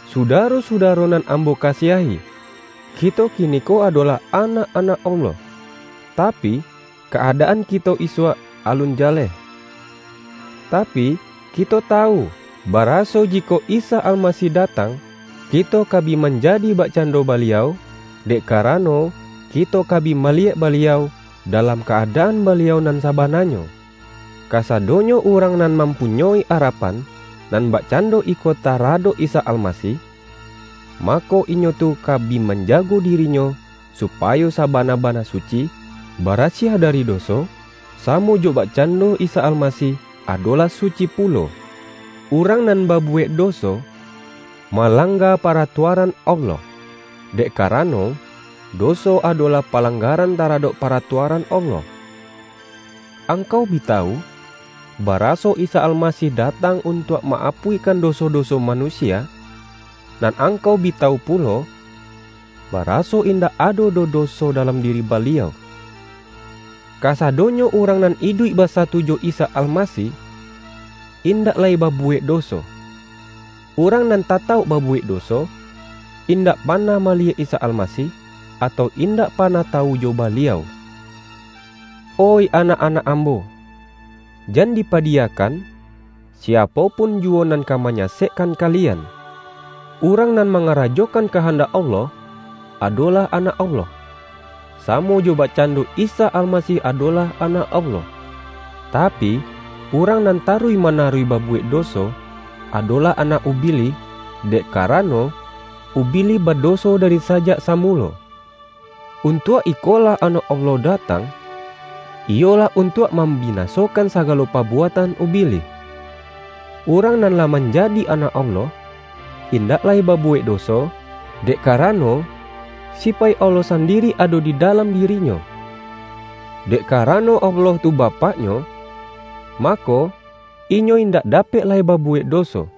Sudaro-sudaro nan am-bo kasiahi! Kito kiniko adolah anak-anak Allah, tapi, ka-adaan kito isuak alun jaleh. Tapi, kito tawu, baraso ji-kok Isa Almasih datang, kito ka bi manjadi bakcando Baliau, dek kara-no, kito ka bi maliyek Baliau, dalam ka-adaan Baliau nan sabananyo. Ka-sadonyo urang nan mampunyoi ara-pan nan bakcando iko taradok Isa Almasih, mako, inyo tu ka bi manja-go dirinyo supayo sabana-bana suci, barasiah dari doso, samo jo bakcando Isa Almasih, adolah suci pulo. Urang nan babuwek doso, malang-ga paratuaran Allah; dek karano, doso adolah palanggaran taradok paratua-ran Allah. Angkau bi tawu, baraso Isa Almasih datang untuak ma-apuih-kan doso-doso manusia, nan angkau bi tawu pulo, baraso indak ado doh doso dalam diri Baliau. Kasadonyo urang nan iduik basatu jo Isa Alma-sih, indak lai babuwek doso. Urang nan tatauk babuwek doso, indak pa-nah maliyek Isa Almasih, atau indak panah tawu jo Baliau. Oih anak-anak ambo, jan dipadi-yakan siapo pun juwo nan ka manya-sekkan kalian. Urang nan mangara-jokan kahandak Allah, adolah anak Allah, samo jo bakcando Isa Alma-sih adolah Anak Allah. Tapi, urang nan taruih manaruih babuwek doso, adolah anak Ubilih, dek karano, Ubi-lih badoso dari sajak samulo. Untuak ikolah Anak Allah datang, iyolah un-tuak mambinasokan sagalo pabuatan Ubilih. Urang nan lah manjadi anak Allah, indak lai babuwek doso, dek karano, sipaik Allah sandiri ado di dalam diri-nyo. Dek karano Allah tu Bapak-nyo, mako, inyo indak dapek lai babuwek doso.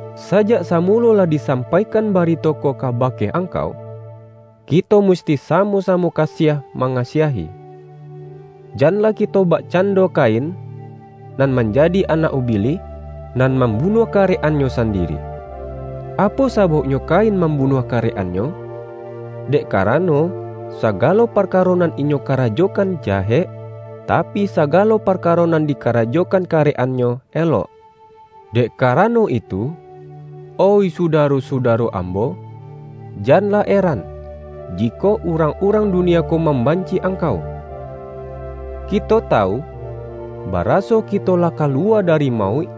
Sajak samulo lah disampaikan ba-rito ko kabake angkau: Kito musti sa-mo-samo kasiah mangasiahi. Jan-lah kito bakcando Kain, nan manjadi anak Ubilih, nan mambunuah karek-annyo sandiri. Apo sabauknyo Kain mambunuah karek-annyo? Dek kara-no, sagalo parkaro nan inyo karajo-kan jahek, tapi, sagalo parkaro nan dikarajokan karek-annyo elok. Dek karano itu, oih sudaro-su-daro ambo, janlah eran, jikok urang-urang dunia ko mambanci-i angkau. Kito tawu, baraso kito lah kaluwa dari mauik,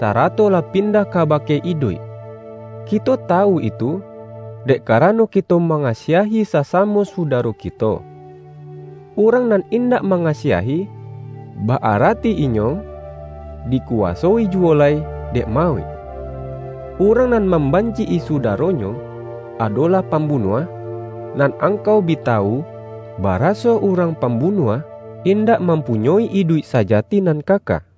sarato lah pindah kaba-ke iduik. Kito tawu itu, dek karano kito mangasiahi sasamo sudaro kito. Urang nan indak mangasiahi, ba-ara-ti inyo, dikuwasoi juwo lai dek ma-uik. Urang nan mambanci-i su-daronyo, adolah pambunuah, nan angkau bi tawu, baraso urang pam-bunuah indak mampunyoi iduik saja-ti nan kaka.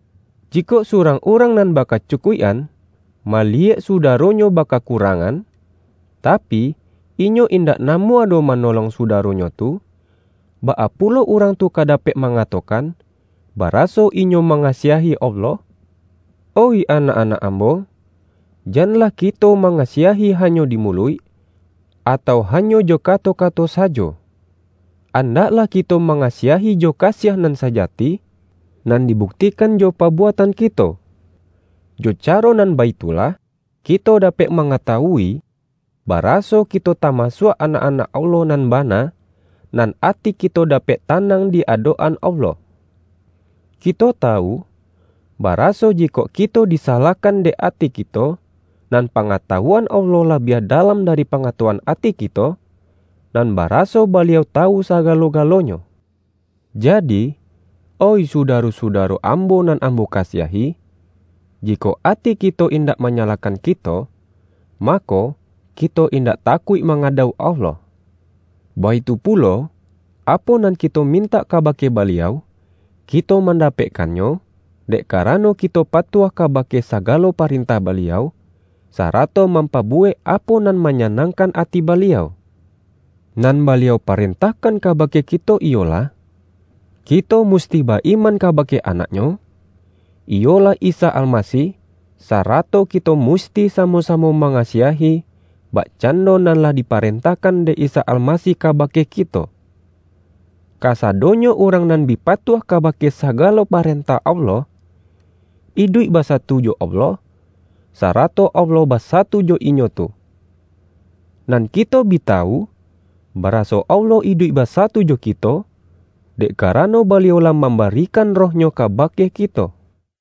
Jikok surang urang nan bakacukuik-an, maliyek sudaro-nyo bakakurangan, tapi, inyo indak namuah doh manolong sudaronyo tu, baa pulo urang tu ka dapek mangato-kan, baraso inyo mangasiahi Allah? Oih anak-anak ambo! Janlah kito mangasiahi hanyo di muluik, atau ha-nyo jo kato-kato sajo. Andaklah kito mangasiahi jo kasiah nan sajati, nan dibuktikan jo pabuatan kito. Jo caro nan baitu lah kito dapek mangatawui, baraso kito tamasuak anak-anak Allah nan bana, nan ati kito dapek tanang di adok-an Allah. Kito tawu, baraso, jikok kito disa-lahkan dek ati kito, nan pangatawuan Allah labiah dalam dari pangatawuan ati kito, nan baraso Baliau tawu saga-lo-galonyo. Jadi, oih sudaro-suda-ro ambo nan ambo kasiahi, jikok ati kito indak manyalahkan kito, mako, kito indak takuik mangadauk Allah. Baitu pulo, apo nan kito mintak kabake Baliau, kito mandapekkan-nyo, dek karano, kito patuah kabake sagalo parentah Baliau, sarato mam-pabuwek apo nan manyanangkan ati Baliau. Nan Baliau parentahkan ka-bake kito iyolah: Kito musti ba-iman kabake Anak-Nyo, iyolah Isa Alma-sih, sarato kito musti samo-samo ma-ngasiahi, bakcando nan lah diparen-tahkan dek Isa Almasih kabake kito. Kasadonyo urang nan bi patuah kabake sagalo parentah Allah, iduik basatu jo Allah, sarato Allah basatu jo inyo tu. Nan kito bi tawu, baraso Allah iduik basatu jo kito, dek kara-no Baliau lah mambarikan Roh-Nyo kabake kito.